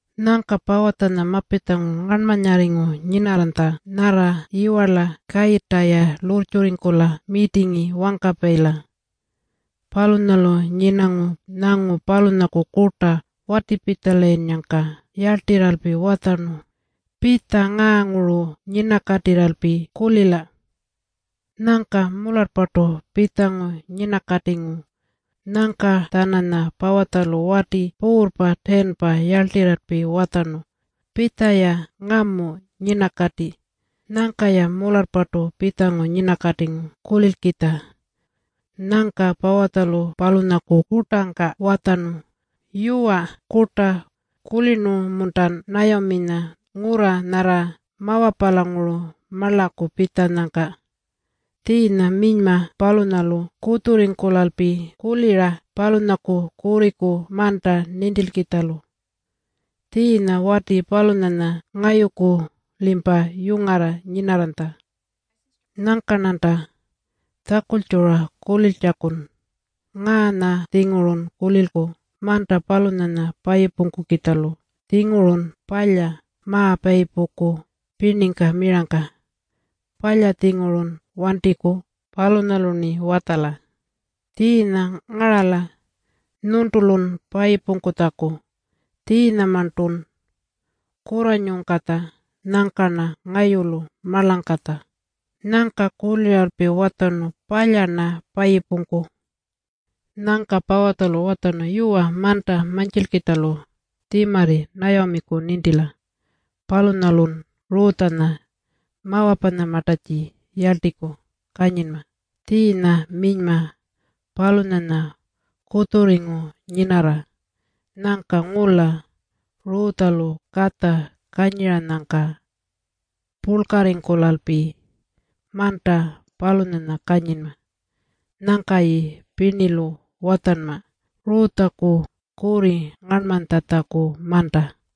Nyangka Pawutjanya mapitjangu ngarnmanyarringu nyinarranytja nyarra yiwarla kayirrta-ya lurrtjurringkula mirtingi wangkapayila. Palunyalu nyinangu nyangu palunyaku kurta watipitjalayinnyangka yarltirralpi watjarnu, “Pitja ngaanguru nyinakatirralpi kulila.” Nyangka mularrpartu pitjangu nyinakatingu. Nyangka-tjananya Pawutjalu wati puurrpa 10-pa yarltirralpi watjarnu, “Pitja-ya ngamu nyinakati.” Nyangka-ya mularrpartu pitjangu nyinakatingu kulilkitja. Nyangka Pawutjalu palunyaku kurtangka watjarnu, “Yuwa Kurta, kulirnu-muntan Nayaminya ngurra nyarra Mawapalanguru marlaku pitjanyangka? Tjiinya minyma palunyalu kutjurringkulalpi kulira palunyaku kurriku manta nintilkitjalu. Tjiinya wati palunyanya ngayuku-limpa yungarra nyinarranytja. Nyangka-rnanta tjakultjura kuliltjakun. Ngaanya-tjingurun kulilku manta palunyanya payipungkukitjalu. Tjingurun palya ma-payipungku pirningka mirangka. Palya-tjingurun wantiku. Palunyalu-rni watjala. Tjiinya ngarala nyuntulun payipungkutjaku. Tjiinyamarntun kurranyungkatja. Nyangka-rna ngayulu marlangkatja.” Nyangka kuliralpi watjarnu, “Palya-rna payipungku.” Nyangka Pawutjalu watjarnu, “Yuwa, manta mantjilkitjalu tjimarri Nayamiku nintila. Palunyalun Rutjanya Mawapanyamartatji yarltiku kanyinma. Tjiinya minyma palunyanya kutjurringu nyinarra. Nyangka ngula Rutjalu katja kanyiranyangka purlkarringkulalpi manta palunyanya kanyinma. Nyangka-ya pirnilu watjanma Rutjaku kurri ngarnmanytjatjaku manta.”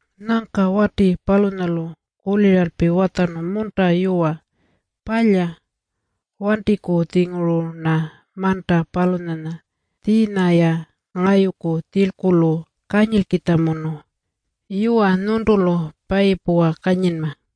Nyangka wati palunyalu kuliralpi watjarnu, “Munta yuwa. Palya. Wantiku-tjinguru-rna manta palunyanya. Tjiinya-ya ngayuku tjilkulu kanyilkitjamunu. Yuwa, nyuntulu payipuwa kanyinma.”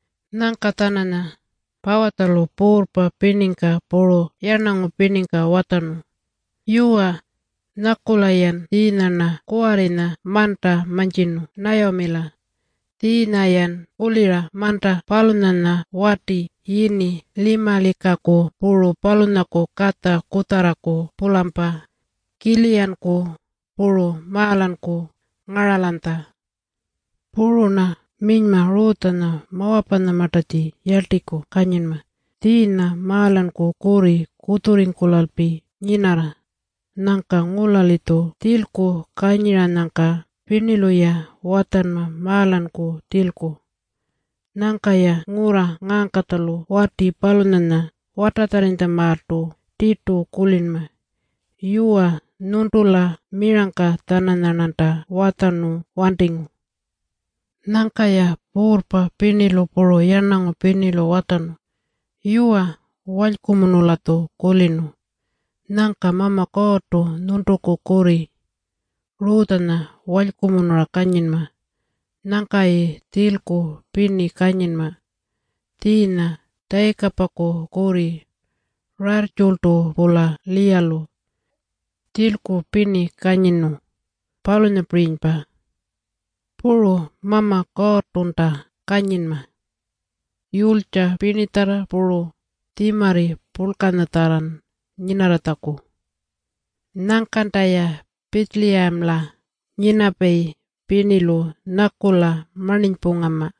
Nyangka-tjananya Pawutjalu puurrpa pirningka puru yarnangu pirningka watjarnu, “Yuwa, nyakula-yan tjiinya-rna kuwarrinya manta mantjirnu Nayamila. Tjiinya-yan kulira manta palunyanya wati yini Limalikaku puru palunyaku katja kutjarraku-pulampa Kiliyanku puru Maalanku ngaralanytja. Puru-rna minyma Rutjanya Mawapanyamartatji yarltiku kanyinma, tjiinya Maalanku kurri kutjurringkulalpi nyinarra. Nyangka ngula-litju tjilku kanyiranyangka pirnilu-ya watjanma Maalanku tjilku. Nyangka-ya ngurra ngaangkatjalu wati palunyanya watatjarrinytjamaaltu tirtu kulinma. Yuwa, nyuntula mirangka-tjananyarnanta watjarnu wantingu.” Nyangka-ya puurrpa pirnilu puru yarnangu pirnilu watjarnu, “Yuwa, walykumunu-latju kulirnu. Nyangka Mama Kuurrtu nyuntuku kurri Rutjanya walykumunura kanyinma nyangkayi tjilku pirni kanyinma. Tjiinya Tjayikapaku kurri Rayirrtjultu-pula Liyalu tjilku pirni kanyirnu, palunyapirinypa. Puru Mama Kuurrtunta kanyinma yulytja pirnitjarra puru tjimarri purlkanyatjarran nyinarratjaku. Nyangkanta-ya Pitjiliyamala nyinapayi pirnilu nyakula marninypungama.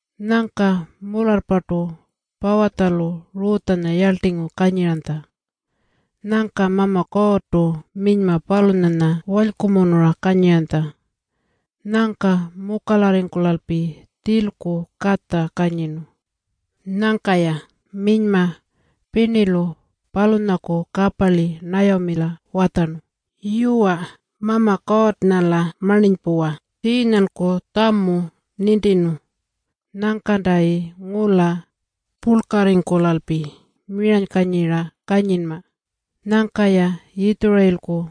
Nyangka mularrpartu Pawutjalu Rutjanya yarltingu kanyiranytja. Nyangka Mama Kuurrtu minyma palunyanya walykumunura kanyiranytja. Nyangka mukalarringkulalpi tjilku katja kanyirnu. Nyangka-ya minyma pirnilu palunyaku kaparli Nayamila watjarnu, “Yuwa, Mama Kuurrnga-la marninypuwa. Tjiinyanku tjamu nintirnu. Nyangkantayi ngula purlkarringkulalpi miranykanyira kanyinma. Nyangka-ya Yitjurayilku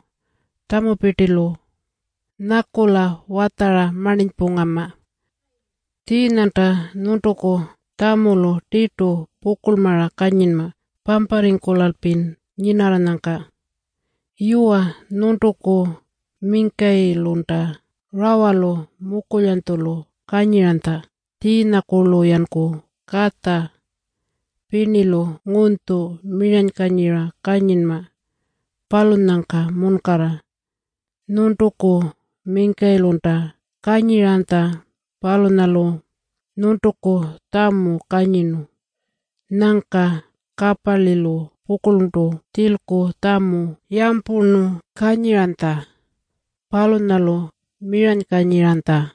tjamupirtilu nyakula watjara marninypungama. Tjiinyanta nyuntuku tjamulu tirtu pukurlmara kanyinma pamparringkulalpin nyinarranyangka. Yuwa, nyuntuku mingkayilunta rawalu mukulyanytjulu kanyiranytja. Tjiinyakurlu-yanku katja pirnilu ngunytju miranykanyira kanyinma, palunyangka munkarra nyuntuku mingkayilunta kanyiranytja. Palunyalu nyuntuku tjamu kanyirnu.” Nyangka kaparlilu pukurltu tjilku tjamu yampurnu kanyiranytja. Palunyalu miranykanyiranytja.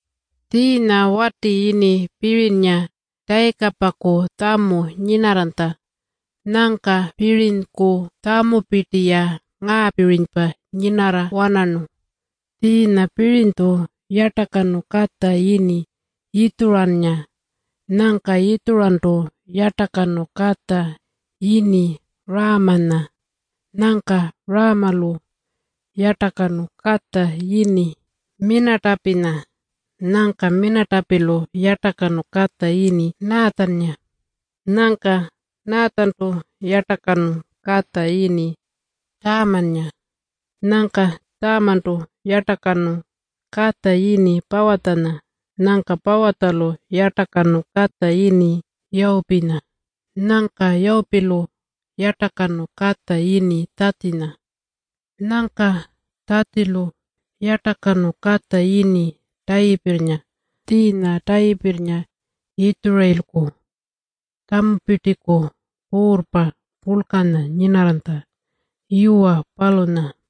Tjiinya wati yini Pirinynga Tjayikapaku tjamu nyinarranytja. Nyangka Pirinyku tjamupirti-ya ngaapirinypa nyinarra-wanarnu. Tjiinya Pirinytju yartakanu katja yini Yitjurannga. Nyangka Yitjurantu yartakanu katja yini Raamanya. Nyangka Raamalu yartakanu katja yini Minatapinya. Nyangka Minatapilu yartakanu katja yini Naatjannga. Nyangka Naatjantu yartakanu katja yini Tjamannga. Nyangka Tjamantu yartakanu katja yini Pawutjanya. Nyangka Pawutjalu yartakanu katja yini Yawupinya. Nyangka Yawupilu yartakanu katja yini Tjatjinya. Nyangka Tjatjilu yartakanu katja yini Tayipirrnga. Tjiinya Tayipirrnga Yitjurayilku tjamupirtiku puurrpa purlkanya nyinarranytja. Yuwa, palunya.